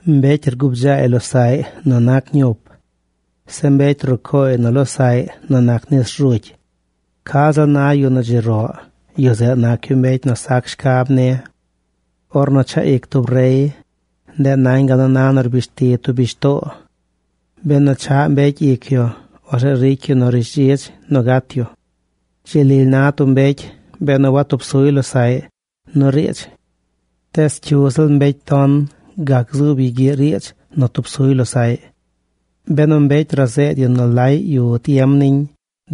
Mbecy rgubdzaay losaꞌy nu nac ñup. Zeꞌ mbecy rucooy nu losaꞌy nu nac nis rzugy. Ca ziꞌl na yu nu dzi roꞌ, yu zeꞌ nac yu mbecy nu sac shcab ni. Ornu chaꞌ ic tub rey, ndeꞌ nañ gal nu na nu rbishti tub bishtoo. Benu chaꞌ mbecy ic yu, orzeꞌ ricy yu nu rishdzidz nu gat yu. Dzi lily na tub mbecy benu watub suy losaꞌy nu riidz. Tees cyu ziꞌl mbecy ton gac gzuub yu gyiꞌ riidz nu tub suy losaꞌy. Benu mbecy razeed yu nu laꞌy yu tiem niñ,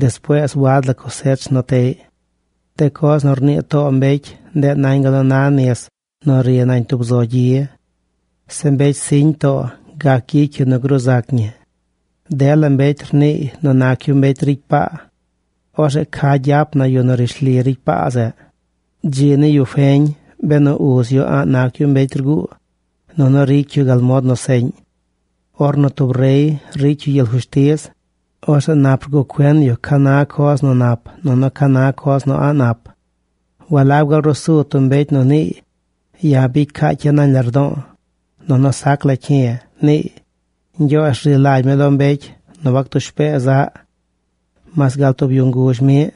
despuees wad la cosech nu teꞌy. De coz nu rnii too mbecy ndeꞌ nañ gal nu na nis nu ri nañ tub zo gyi. Zeꞌ mbecy siñ too gac gyicy yu nu gruu zac ñi. Dela mbecy rniiy nu nac yu mbecy ricy paa. Orzeꞌ ¿ca gyap na yu nu rishli ricy paa zeꞌ? Dzi ni yu feñ benu uz yu a̱ꞌ nac yu mbecy rguu, nunu ricy yu gal mod nu seꞌñ. Ornu tub rey ricy yu gyel fushtiz, orzeꞌ nap rguꞌ cuen yu ca na coz nu nap nunu ca na coz nu a̱ꞌ nap. ¿Walab gaal ruu su tub mbecy nu niiy: “Ya̱ bicy caacya̱ nañ lardo̱o̱, nunu sac la cyi̱”, niiy? Ñgyoozh rzi lagy mi lo mbecy nu wactush pee zaꞌ. Mas gal tub yu nguzh miꞌ,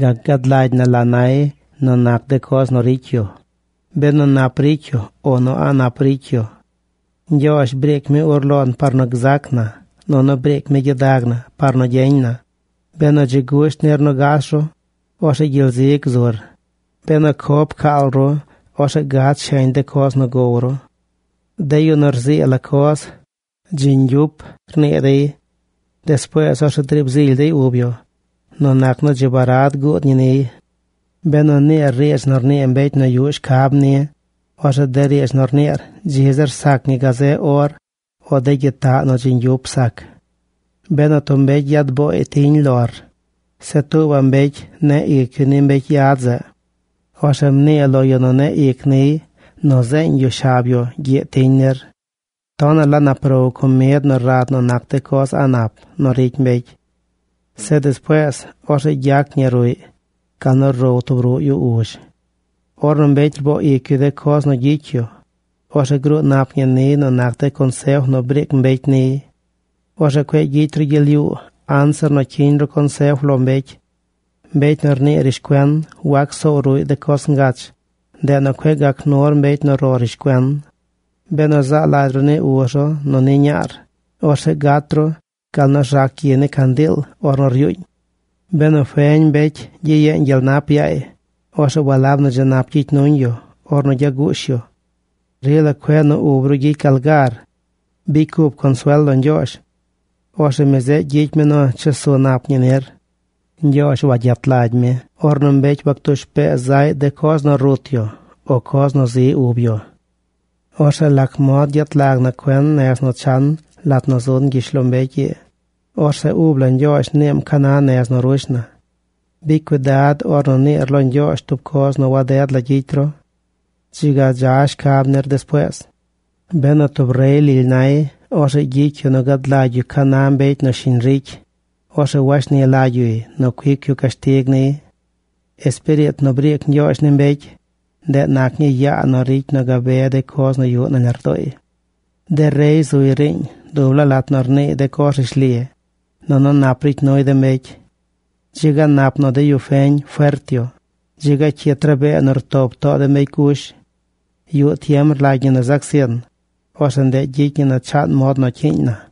gac gad lagy na la nay nu nac de coz nu ricy yu, benu nap ricy yu o nu a̱ꞌ nap ricy yu. Ñgyoozh briic mi ur lon par nu gzac na, nunu briic mi gyidag na par nu gyeñ na. Benu dzi gusht nir nu gas ru, orzeꞌ gyel zi gzur. Benu co pcaal ru, orzeꞌ gad sheñ de coz nu gow ru. De yu nu rzii la coz: “Dzi ñgyup”, rnii dey. Despuees orzeꞌ driib zily dey ub yu nu nac nu dzi barad guud ñi niy. Benu rniir riidz nu rnii mbecy nu yuꞌ shcab ni, orzeꞌ de riidz nu rniir dzi zir sac ñi gazeꞌ or o de gyitaꞌ ña nu dzi ñgyup sac. Benu tub mbecy yad booy tiñ lor, zeꞌ tuubaꞌ mbecy neꞌ ic yu ni mbecy yad zeꞌ, orzeꞌ mnii lo yu nu neꞌ ic niy nu rzeeñ yu shab yu gyiꞌ tiñ nir. Tonaꞌ la nap row comid nu rad nu nac de coz a̱ꞌ nap nu ricy mbecy. Zeꞌ despuees orzeꞌ gyac ñi ruꞌy gal nu row tub ruꞌ yu uzh. Ornu mbecy rboo ic yu de coz nu gyicy yu, orzeꞌ gruu nap ñi niy nu nac de consef nu briic mbecy niy. Orzeꞌ cueꞌ gyicy ru gyel yuu anzir nu cyiñ ru consef lo mbecy. Mbecy nu rnii rishcuen wagac soow ruꞌy de coz ngach. Ndeꞌ nu cueꞌ gac nur mbecy nu ro rishcuen. Benu zaa lagy ru ni uz ru nu ni ñaar, orzeꞌ gat ru gal nu rzac gyi ni candiil ornu ryuuñ. Benu feñ mbecy gyiyeeñ gyel nap yaay, orzeꞌ walab nu dzi nap gyicy nuñ yu ornu gyaguush yu. Rila cueꞌ nu ub ru gyicy gal gar. Bicy cup consuel lo Ñgyoozh. Orzeꞌ mi zeꞌ gyicy mi nu chesu nap ñi nir. Ñgyoozh wayet lagy mi ornu mbecy wac tush pee zaꞌy de coz nu rut yu o coz nu zi ub yu. Orzeꞌ ¿lac mod gyet lag na cuen nez nu chan lat nu zun gyishlombecy ii? Orzeꞌ ub la Ñgyoozh niim ca na nez nu rush na. Bicy cuidad ornu niir lo Ñgyoozh tub coz nu waded la gyicy ru. Dzi ga dza shcab nir despuees. Benu tub rey lily nay, orzeꞌ gyicy yu nu gad lagy yu ca na mbecy nu shiñ ricy. Orzeꞌ washni lagy yuy nu cuic yu cashtig niy. Espiriit nu briic Ñgyoozh ni mbecy, ndeꞌ nac ñii yaa nu ricy nu gabe de coz nu yuꞌ nañ lardooy. De rey zuy riiñ dub laa lat nu rniiy de coz rishli, nunu nap ricy nuy de mbecy. Dzi ga nap nu de yu feñ fert yu. Dzi ga cyit rabee nu rtop too de mbecy gush. Yuꞌ tiem rlagy ñi nu zac zin, orzeꞌ ndeꞌ gyicy ñi nu chaan mod nu cyiiñ na.